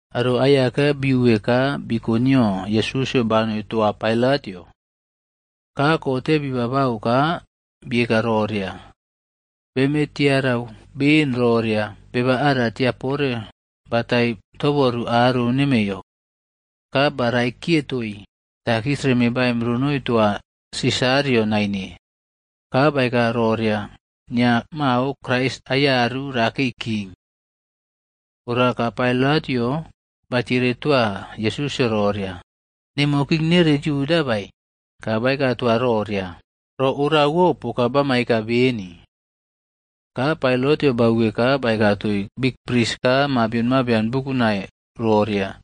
Aro aiyaka biuwe ka biko nio Yesusꞌyo banoi toa Pailatꞌyo. Ka kote bi babau ka bieka roria, “Beme tiarau beni roria beba ara tiapore batai toboru aro nemeiyo. Ka ba raikiye toii takis reme baim ronoi toa Sisarꞌyoa naine. Ka baeka roria nia mao Krais aiyaru rakei king.” Ora ka Pailatꞌyo batiere toa Yesusꞌyo roria, “Nemo king nere Yuda bae?” Ka baeka toa roria, “Ro orawo poka bama eka beni.” Ka Pailatꞌyo bauwe ka baeka toii bikpris ka mabion mabian bukunai roria,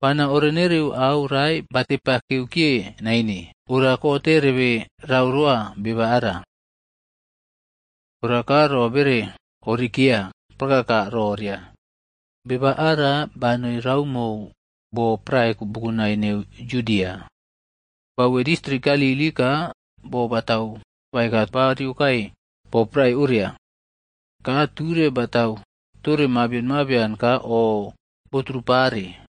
“Bana orenereu au rae batepakeu kiye naine ora kote rebe rau roa beba ara.” Ora ka ro bere oriꞌkeya prakaka roria, “Beba ara banoi raumou bo prae bukunai neu Yudia. Bauwe distrik Galili ka bo batau bakae ba riyokae bo prae oria. Ka ture batau tore mabion mabian ka oꞌboturupare.”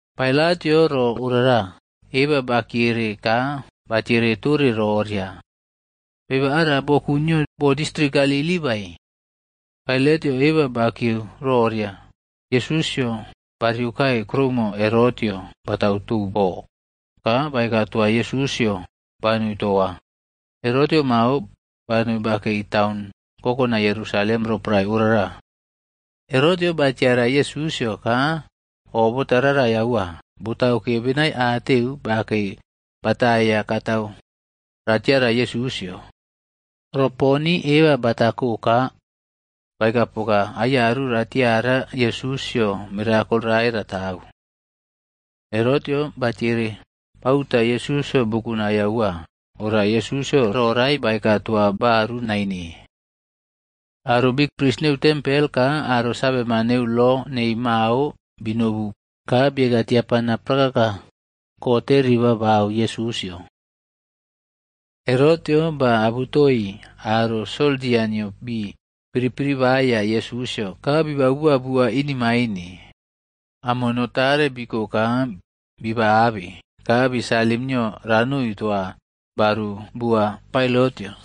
Pailatꞌyo ro orara eba bakiyere ka batiere tore roria, “Beba ara boku nio bo distrik Galili bae?” Pailatꞌyo eba bakieu roria Yesusꞌyo bariokae kuroumo Herotꞌyo batau tou bo, ka baeka toa Yesusꞌyo banoi toa. Herotꞌyo mao banoi bakei taun kokonai Yerusalem roporae orara. Herotꞌyo batiara Yesusꞌyo ka o botaꞌrarai aua, botauke benaiateu bakei bataiya katau ratiara Yesusꞌyo. Ro poni eba batako ka baeka poka aiyaru raꞌtiara Yesusꞌyo mirakol rae ratau. Herotꞌyo batiere bauta Yesusꞌyo bukunai aua, ora Yesusꞌyo ro rae baeka toa baru naine. Aro bikpris neu tempel ka aro saveman neu lo nei mao binobu ka bieka tiapana prakaka kote ribaꞌbau Yesusꞌyo. Herotꞌyo baꞌabutoi aro soldia nio bii piripiriꞌbaiya Yesusꞌyo ka bibau bua inemaine. Amono tare biko ka biba abeb ka bi salim nio ranoi toa baru bua Pailatꞌyo.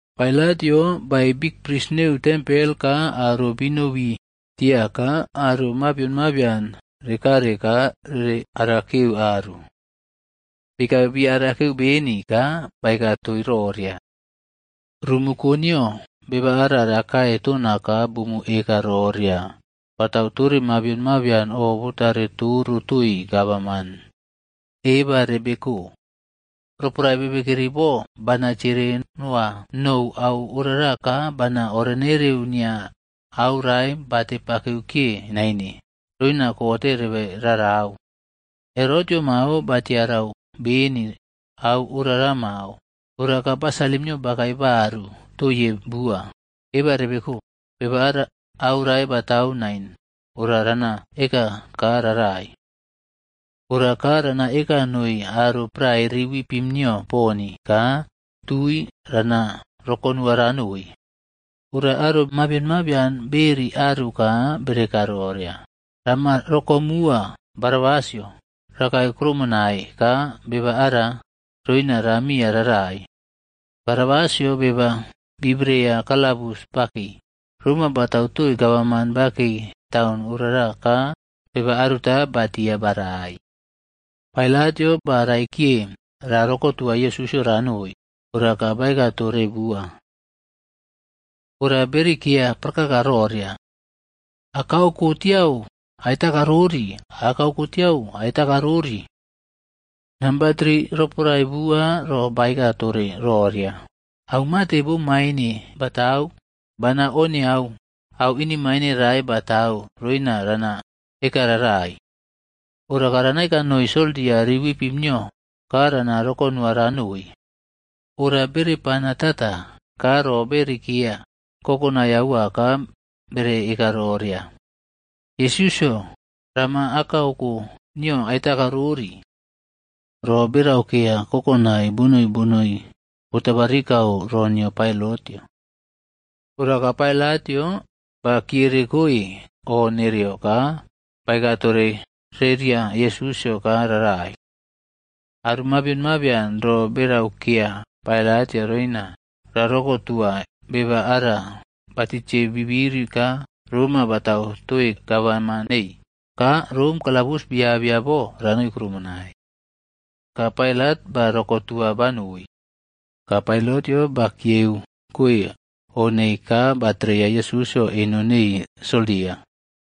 Pailatꞌyo baei bikpris neu tempel ka aro binobi tia ka aro mabion mabian rekare ka rere arakeu aru. Bii kabe bi arakeu beni ka baeka toii roria, “Rumu koniyo beba ara rakae tona ka bumu eka roria batau tore mabion mabian o botare toro toii gavaman. Eba rebe ko! Roporae bebekeri bo bana tiere noa nou au orara ka bana orenereu nia aurae batepakeu kiye naine roina kote rebe rarau. Herotꞌyo mao ba tiarau beni au orara mao, ora ka ba salim nio bakae baru toiye bua. Eba rebeko. Beba ara aurae batau nain ora rana eka ka rarai. Ora ka rana eka noi aro prae riwipim nio poni ka tui rana roko nua ranoi.”c Ora aro mabion mabian beꞌeri aru ka bere eka roria, “Rama rokomuwa Barabasꞌyo rakae krumonai ka beba ara, roina ramiya rarai.” Barabasꞌyo beba bibreya kalabus bakei. Roma batau toii gavaman bakei taun orara ka beba aruta batia barai. Pailatꞌyo ba raikiye ra rokotuwa Yesusꞌyo ranoi, ora ka baeka tore bua. Ora berikeya prakaka roria, “Akaoko tiau aiꞌtakarori! Akaoko tiau aiꞌtakarori!” Namba tri roporae bua ro baeka tore roria, “Au mate bomaine batau? Bana oniau au inemaine rae batau roina rana eka rarai. Ora ka rana eka noi soldia riwipim nio ka rana rokonuwa ranoi.” Ora bere pana tata ka ro beꞌeri keya kokonai aua ka bere eka roria, “Yesusꞌyo Rama akaoko nio aiꞌtakarori.” Ro berau keya kokonai bonoi bonoi botabarikau ro nio Pailatꞌyo. Ora ka Pailatꞌyo ba kiyerekoe o nereo ka baeka tore reria Yesusꞌyo ka rarai. Aro mabion mabian ro beraukeya Pailatꞌyo roina rarokotua beba aro batitiei bibiri ka roma batau toii gavaman neii, ka Rom kalabus biabeya bo ranoi krumonai. Ka Pailat ba rokotua banoi. Ka Pailatꞌyo bakiyeu koe o neii ka batreya Yesusꞌyo eno neii soldia.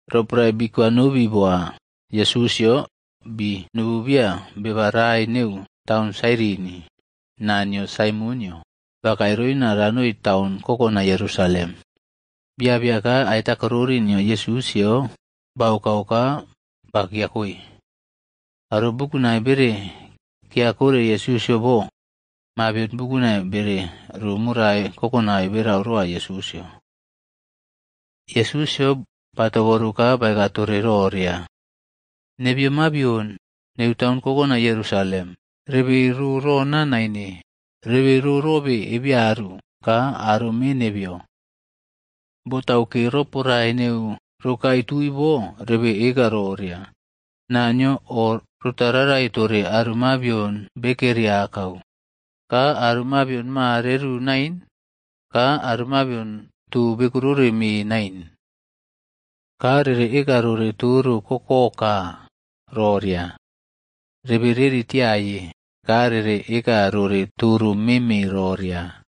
Roporae bi kwanobi boa Yesusꞌyo, bii nobu biya beba rae neu taun Sairini. Naa nio Saimonꞌyo bakae roina ranoi taun kokonai Yerusalem. Bii abeya ka aiꞌtakarori nio Yesusꞌyo baokau ka ba kiyakoe. Aro bukunai bere kiyakore Yesusꞌyo bo. Mabion bukunai bere ro morai kokonai berau roa Yesusꞌyo. Yesusꞌyo ba toboru ka baeka tore roria, “Nebeyo mabion neu taun kokonai Yerusalem, rebe ro rona naine. Rebe ro robe ebeyaru ka aro me nebeyo. Botauke roporae neu rokae tui bo rebe eka roria, ‘Naniyo o rotaꞌrarai tore aro mabion bekeri akau, ka aro mabion ma reru nain, ka aro mabion too bekorore mee nain.’ Ka rere eka rore toro kokoka roria, Rebe reri tiaye,’ ka rere eka rore toro meme roria,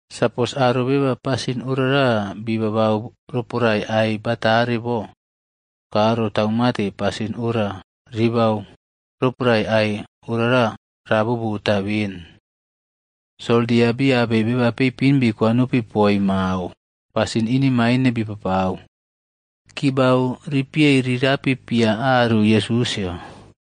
Sapos aro beba pasin orara bii babau roporae ai batare bo ka rotau mate pasin ora ribau roporae ai orara raꞌbobotae ben?” Soldia bii abei beba peipin bikwanopi poi mao, pasin inemaine bipapau. Kibau ribiei rirapi pia raru Yesusꞌyo.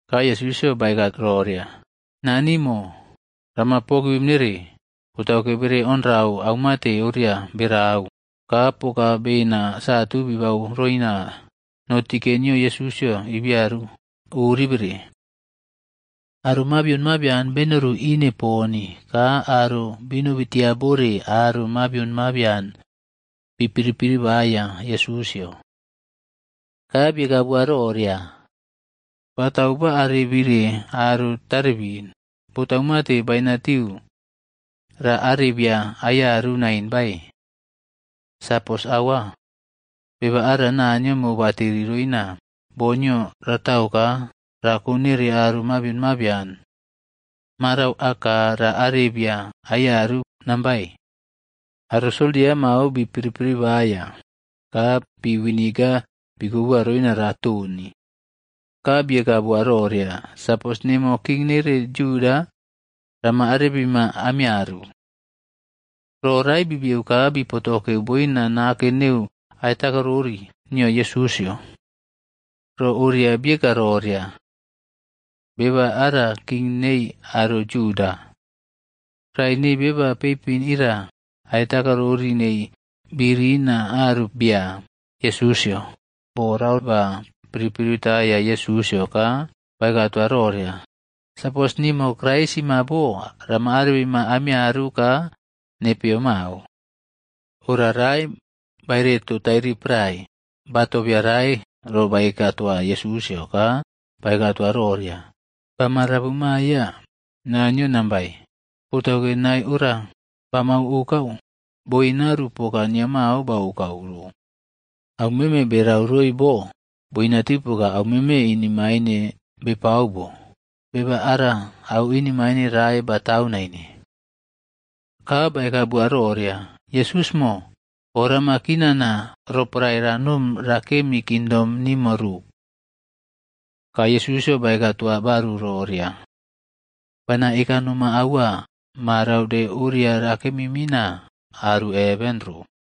Ka Yesusꞌyo baeka roria, “Naniꞌmo, rama pogivim nere. Botauke bere onrau aumate oriawo berau.” Ka poka bena satu bibau roina notike nio Yesusꞌyo ibiaru oribere. Aro mabion mabian benoru ine poni, ka aro binobi tia bore aro mabion mabian bi piripiriꞌbaiya Yesusꞌyo. Ka bieka boa roria, “Batau ba arebire aro tarebin, botau mate bainatiu ra arebiya aiyaru nain bae? Sapos aua, beba ara Naniyo mobateri roina bo nio ratau ka rakonere aro mabion mabian, marau aka ra arebiya aiyaru nambae.” Aro soldia mao bi piripiri baiya, ka pi viniga bikoboa roina ratoni. Ka bieka boa roria, “Sapos nemo king nere Yuda, rama arebima amiyaru.” Ro rae bibiyeu ka bi potokeu boina nake neu aiꞌtakarori nio Yesusꞌyo. Ro oria boeka roria: BEBA ARA KING NEI ARO JUDA. Rae nei beba peipin ira aiꞌtakarori nei birina aru bia Yesusꞌyo bo rae ba pripriꞌtaiya Yesusꞌyo ka baeka toa roria, “Sapos nimo Kraisꞌmo bo, rama arebima amiyaru ka nepeyo mao.” Ora rae baeretou tairiprae, ba tobeya rae ro baeka toa Yesusꞌyo ka baeka toa roria, “Bama rabuꞌmaiya Naniyo nain bae? Botauke nae ora bama okau, boinaru poka nia mao baokau ro. Aumeme berau roi bo, boinatiu poka aumeme inemaine bepau bo. Beba ara au inemain rae batau naine.” Ka baeka bua roria, “Yesusꞌmo, o rama kinana roporae ranom rakemi kingdom nimo ro.” Ka Yesusꞌyo baeka toa baru roria, “Bana eka noma aua, marau de oria rakemi mina aru heven ro.”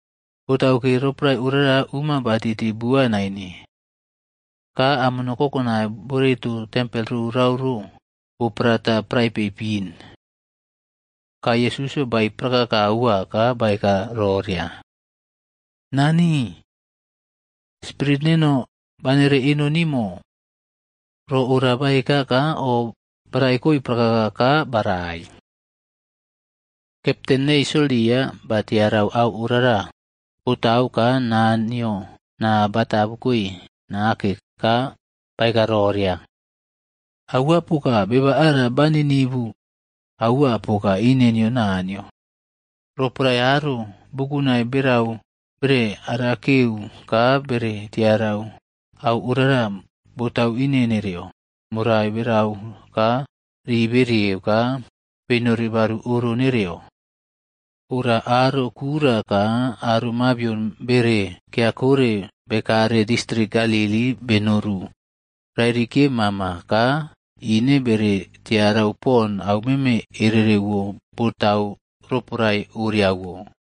Botauke roporae orara umo ba titi bua naine. Ka amono kokonai boereto tempel rorau ro bo praratu prae peipin. Ka Yesusꞌyo baei prakaka aua ka baeka roria, “Nani, spirit neno banere eno nimo.” Roporae ro ora baeka ka oꞌbaraikoe prakaka ka barai. Kepten neii soldiaf ba tiarau au orara botau ka Naniyo naa bata abukoe nake ka baeka roria, “Aua poka, beba ara ba ninivu aua poka ine nio Naniyo.” Roporae aro bukunai berau bere arakeu ka bere tiarau au orara botau ine nereyo, morai berau ka riberieug ka benori baru oro nereyo. Ora aro kura ka aro mabion bere kiyakore bekare distrik Galili benoru rairi kiye mama ka ine bere tiarau pon aumeme erewo botau roporae oriawo.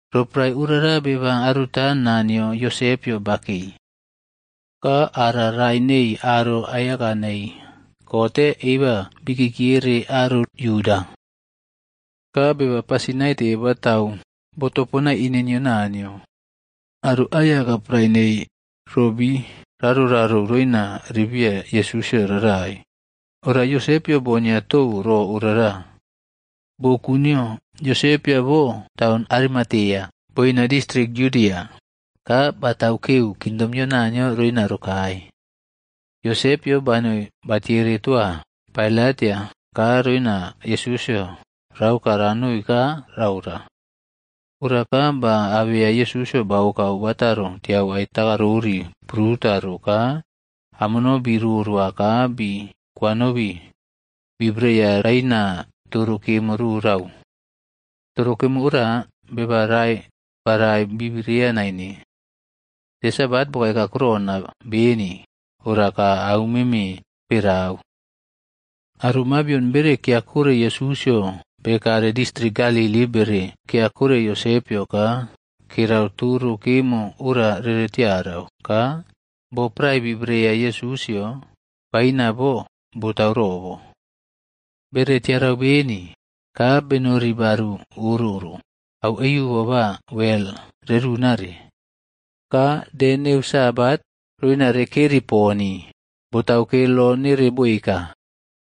Roporae orara beba aruta naa nio Yosepꞌyo bakei. Ka ara rae nei aro aiyaka nei kote eba bikiere aro Yuda. Ka beba pasin naite batau botoponai ine nio Naniyo. Aro aiyaka prae nei ro bii rarouꞌrarou roina ribiya Yesusꞌyo rarai, ora Yosepꞌyo bonea tou ro orara. Boku nio Yosepꞌyo bo taun Arimatea, boina distrik Yudia. Ka batau keu kingdom nio Naniyo roina rokae. Yosepꞌyo banoi batiere toa Pailatꞌyo ka roina Yesusꞌyo raoka ranoi ka raora. Ora ka ba abeya Yesusꞌyo baoka bakotaro tiau aiꞌtakarori pruta ro ka amono bi rorowa ka bi kwanobi bi bereya raina toro kemo rorau. Toro kemo ora, beba rae barai bibereya naine. De Sabat bokae kakurona beni ora ka aumeme berau. Aro mabion bere kiyakore Yesusꞌyo bekare distrik Galili bere kiyakore Yosepꞌyo ka kerau toro kemo ora rere tiarau ka bo prae bibreya Yesusꞌyo baina bo botau robo. Bere tiarau beni, ka benori baru oro ro aueiubo ba wel rerunare. Ka de neu Sabat, roina rekeri poni, botauke lo nere boeka.